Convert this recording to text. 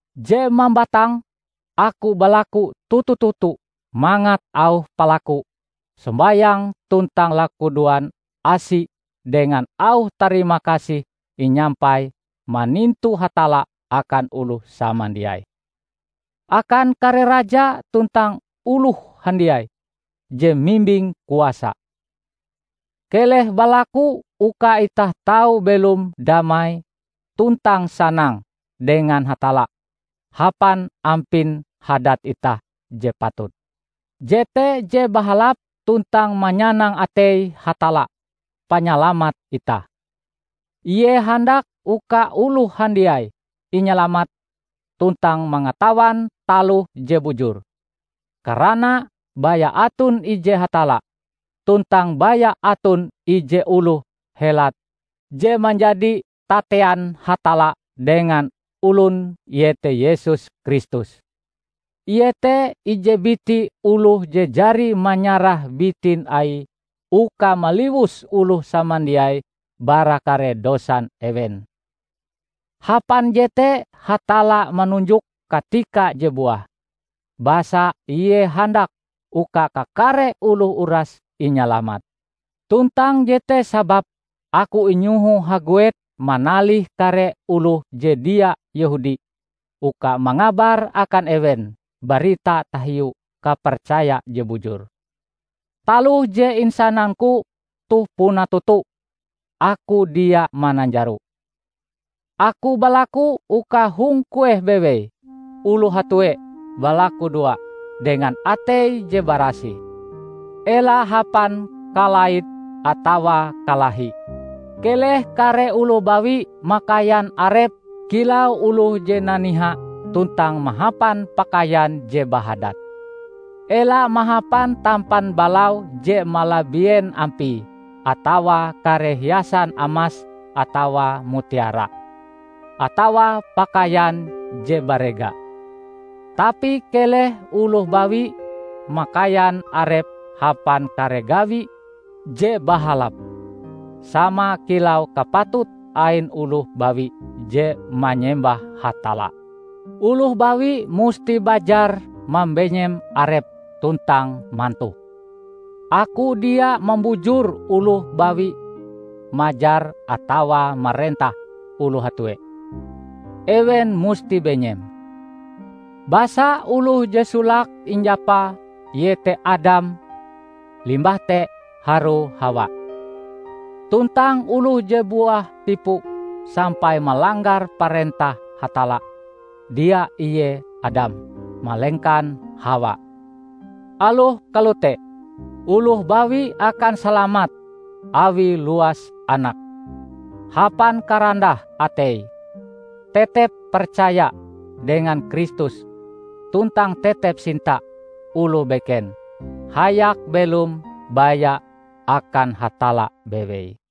Je mambatang, aku balaku toto-toto mangat auh palaku, sombayang tuntang lakudoan asi dengan auh tarimakasih inyampai manintu Hatalla akan oloh samandiai; akan kare raja tuntang oloh handiai je mimbing kuasa. Keleh balaku uka itah tau belom damai tuntang sanang dengan Hatalla hapan ampin hadat itah je patut. Jete je bahalap tuntang manyanang atei Hatalla, panyalamat itah. Ie handak uka oloh handiai inyalamat tuntang mangatawan taloh je bujur. Karana, baya aton ije Hatalla, tuntang baya aton ije oloh helat je manjadi tatean Hatalla dengan olon iete Yesus Kristus. Ie te ije biti oloh je jari manyarah bitin Aie uka maliwus oloh samandiai bara kare dosan ewen. Hapan jete Hatalla manunjok katika je buah, basa Ie handak uka kakare oloh uras inyalamat. Tuntang jete sababe aku inyoho haguet manalih kare oloh je dia Yehudi uka mangabar akan ewen barita tahiu kapercaya je bujur. Taloh je insanangku toh puna toto, aku dia mananjaro. Aku balaku uka hong kueh bewei oloh hatue balakudoa dengan atei je barasih, ela hapan kalait atawa kalahi. Keleh kare oloh bawi makaian arepe kilau oloh je naniha tuntang mahapan pakaian je bahadat. Ela mahapan tampan balau je malabien ampie atawa kare hiasan amas atawa mutiara, atawa pakaian je barega. Tapi keleh oloh bawi makaian arepe hapan kare gawi je bahalap sama kilau kapatut ain oloh bawi je manyembah Hatalla. Oloh bawi musti bajar mambenyem arepe tuntang mantoh. Aku dia mambujur oloh bawi majar atawa marentah oloh hatue; ewen musti benyem. Basa oloh je solake injapa iete Adam limbah te harue Hawa. Tuntang oloh je buah tipu sampai malanggar parentah Hatalla, dia ie Adam, malengkan Hawa. Aloh kalote, oloh bawi akan salamat awie luas anake, hapan karandah ateie tetep percaya dengan Kristus tuntang tetep sinta oloh beken hayak belom baya akan Hatalla bewei.